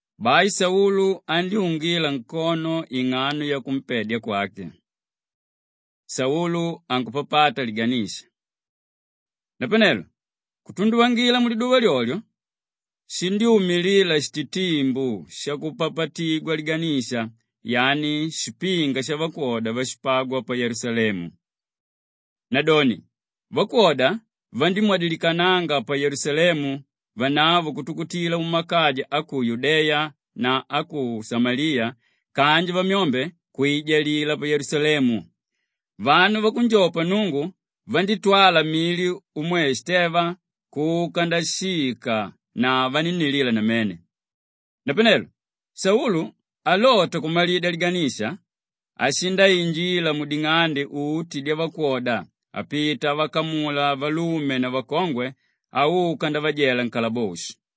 Bai Saulu andyúngila nkono ing'ano yakumpedya kwake. Saulu ankupapata Liganisha Napanelo kutunduvangila muliduva lyolyo, shindyúmilila shititimbu shakupapatigwa liganisha, yani shipinga shavakwoda váshipagwa pa Yelusalemu. Nadoni vakwoda vandívamwadikanianga pa Yelusalemu vanavo kutukutila mumakaja a ku Yudeya na a ku Shamaliya kanji vamyombe vandíijalila pa Yelusalemu. Vanu vakunjopa Nnungu vandítwala mili umwe Shiteva kuka ndashika na vanínnilila namene. Napanelo Saulu alota kumalidya liganisha, ashindainjila muding'ande uti dyavakwoda apita avakamula valume na vakongwe auka ndavajela nkalaboshi.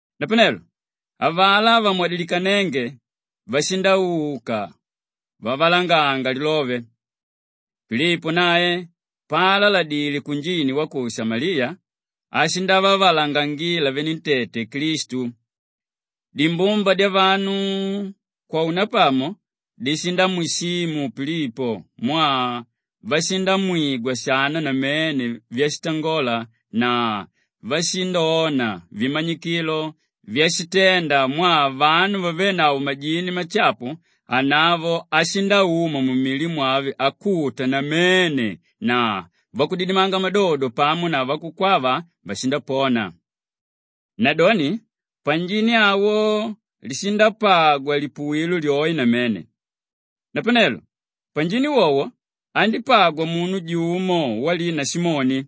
Napanelo avalá vamwadilikanénge vashindauka vavalanganga lilove. Pilipo nae paalaladile kunjini wa ku Shamaliya ashindavavalangangila venentete Klistu. Dimbumba dyavanu kwaunapamo dishindamwishimu Pilipo mwaa vashindamwigwa shana namene vyashitangola na vashindona vimanyikilo vyashitenda mwaa vanu vavénavo majini mashapu, anavo ashindauma mumili mwave akuta namene na vakudidimanga madodo pamo na vakukwava vashindapona. Nadoni panjini awo lishindapagwa lipuwilo lyoe namene. Napanelo panjini wowo, andípagwa munu jumo walina Simoni.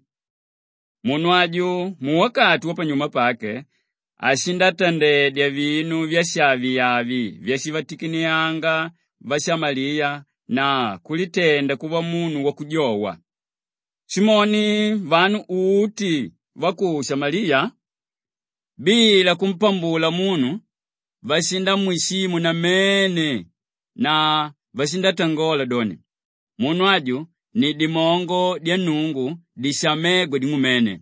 Munu aju muwakati wapanyuma pake ashindatandedya vinu vyashaviavi vyashivatikiniyanga vashamaliya na kulitenda kuva munu wakujowa. Simoni vanu uti va ku Shamaliya bila kumpambula munu vashindamwishimu namene na vashindatangola doni, “Munu aju ni dimongo dya Nnungu dishamégwa ‘Ding'umene.’”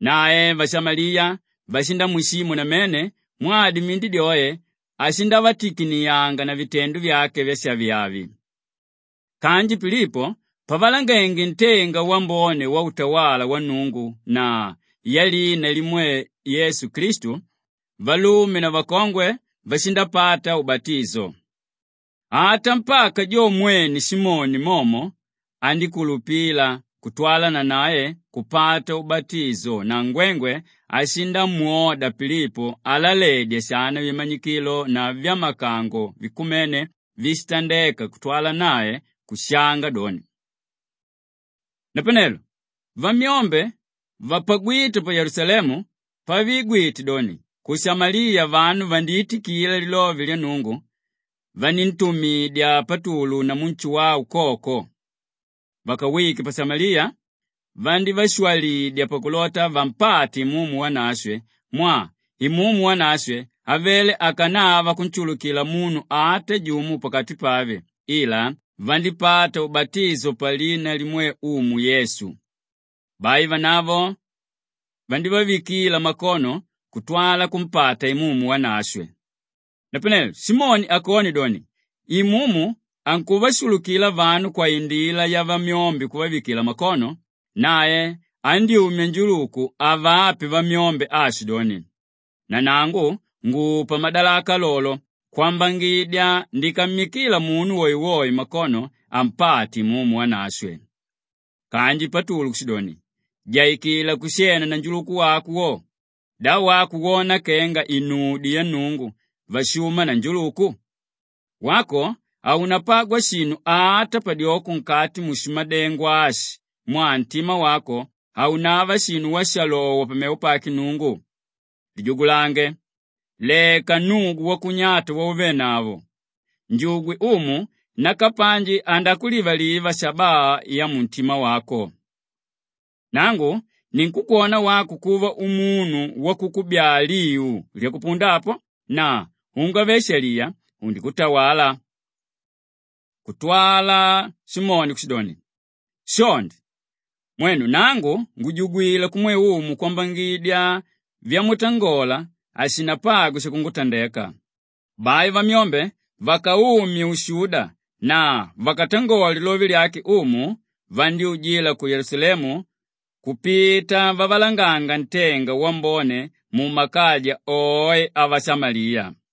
Nae vashamaliya vashindamwishimu namene mwaa dimindi dyoe ashindavatikiniyanga na vitendo vyake vyashaviavi. Kanji Pilipo pavalangenge ntenga wambone wautawala wa Nnungu na yalina limwe Yesu Klistu, valume na vakongwe vashindapata ubatisho. Ata mpaka jo mwene Simoni momo andíkulupila kutwala nanae kupata ubatisho na ngwengwe ashindamwoda Pilipo alaledya shana vimanyikilo na vyamakango vikumene víshitandeka kutwala nae kushanga doni. Napanelo vyamyombe vapagwíte pa Yelusalemu pavigwite doni ku Shamaliya vanu vandiitikila lilove lya Nnungu, vaníntumidya Patulu namu Nshuwau koko. Vakawike pa Shamaliya vandívashwalidya pakulota vampate Imumu Wanashwe mwaa Imumu Wanashwe avele akanava kunshulukila munu ata jumo pakati pave ila vandípata ubatisho palina limwe Umu Yesu. Bai vanavo vandívavikila makono kutwala kumpata Imumu Wanashwe. Napanelo Simoni akone doni, Imumu ankuvashulukila vanu kwaindila yavamyombe kuvavikila makono, nae andyúmya njuluku avape vamyombe aashidoni, “Nanangu ngupa madalaka lolo kwambangidya nikammikila munu woewoe makono ampate Imumu Wanashwe.” Kanji Patulu kushidoni, “Jaikila kushena na njuluku wako wo. Da wako wona kenga inudyo ya Nnungu vashuma na njuluku? Wako haunapagwa shinu ata padyoko nkati mushimadengo ashi mwaa ntima wako haunava shinu washalowa pamevo pake Nnungu. Lijugulange, leka nnugu wakunyata wauvenavo! Njugwe Umu nakapanji andakulivaliva shabaa yamuntima wako. Nangu ninkukwona wako kuva umunu wakukubyaa liu lyakupunda apo na ungave-shaliya undikutawala.” Kutwala Simoni kushidoni, “Shonde, mwenu nangu ngujugwila kumwe Umu kwambangidya vyamutangola hashinapagwe shakungutandeka.” Bai vamyombe vakaumye ushuda na vakatangole lilove lyake Umu, vandyújila ku Yelusalemu kupita vavalanganga ntenga wambone mumakaja oe avashamaliya.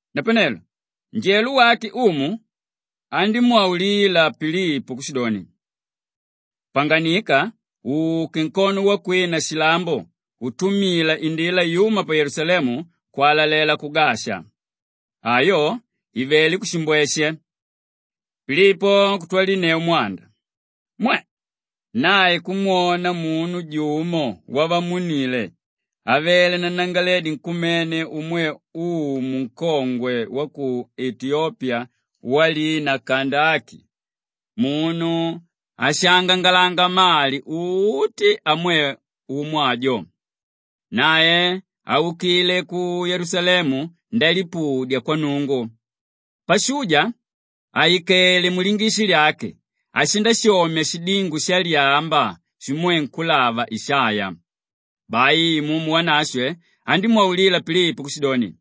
Napanelo njelo wake Umu andímwaulila Pilipo kushidoni, “Panganika uke nkono wakwina shilambo utumila indila yúma pa Yelusalemu kwalalela ku Gasha.” Ayo ivelé kushimbweshe. Pilipo kutwalinneu mwanda. Mwe! Nae kumwona munu jumo wavamuníle avele nanangalaledi nkumene umwe umu nkongwe wa ku Etiyopiya walina Kandaki munu áshaangangalanga mali uti amwe umu ajo. Nae aukile ku Yelusalemu ndalipudya kwa Nnungu. Pashuja àikele mulingishi lyake ashindashomya shidingo shalyamba shimwe nkúlava Ishaiya. Bai Imumu Wanashwe andímwaulila Pilipo kushidoni,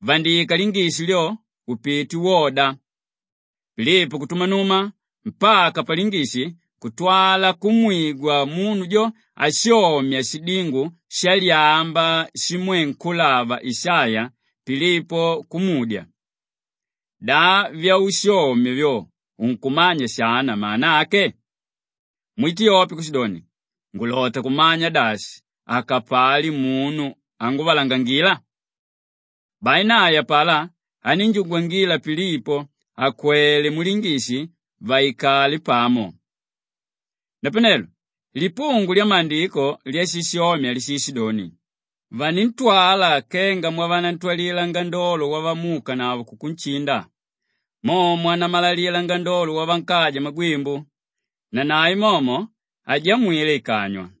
“Vandika lingishi lyo upite woda!” Pilipo kutumanuma mpaka palingishi kutwala kumwigwa munu jo ashomya shidingo shalyamba shimwe nkúlava Ishaiya Pilipo kumudya, “Da vyaushomya vyo unkumanya shana mana ake?” Mwitiyope kushidoni, “Ngulota kumanya dashi akapali munu ánguvalangangila?” Bai nae apalá anínjugwangila Pilipo akwele mulingishi vaikale pamo. Napanelo lipungu lyamaandiko lyashishomya lishishidoni, “Vanintwala kenga mwavanantwalila ngandolo wavamuukanavo kukunshinda, mo mwanamalalila ngandolo pavankaja magwimbu, nanae momo hajamwile ikanywa.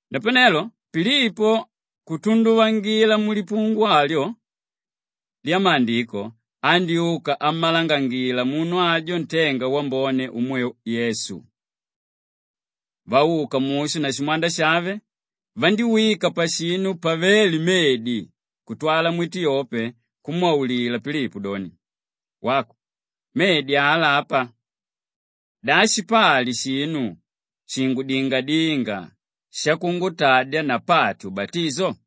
Napanelo Pilipo kutunduvangila mulipungu alyo lyamaandiko andyúka ammalangangila munu ajo ntenga wambone umwe Yesu. Vauka mushu na shimwanda shave, vandíwika pashinu pavéle medi kutwala mwitiyope kumwaulila Pilipo doni, “Wako, medi ala apa. Da shipali shinu shingudingadínga shakungutadya napate ubatisho?”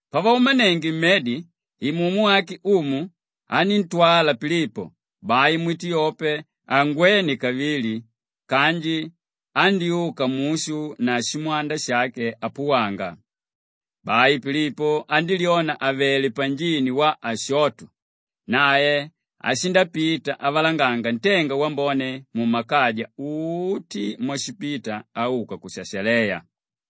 Pavaumanenge mmedi, Imumu wake Umu aníntwala Pilipo; bai mwitiyope hangwene kavili kanji andyúka mushu na shimwanda shake apuwanga. Bai Pilipo andílyona àvele panjini wa Ashoto. Nae ashindapita avalanganga ntenga wambone mumakaja uti mwashipita auka ku Shashaleya.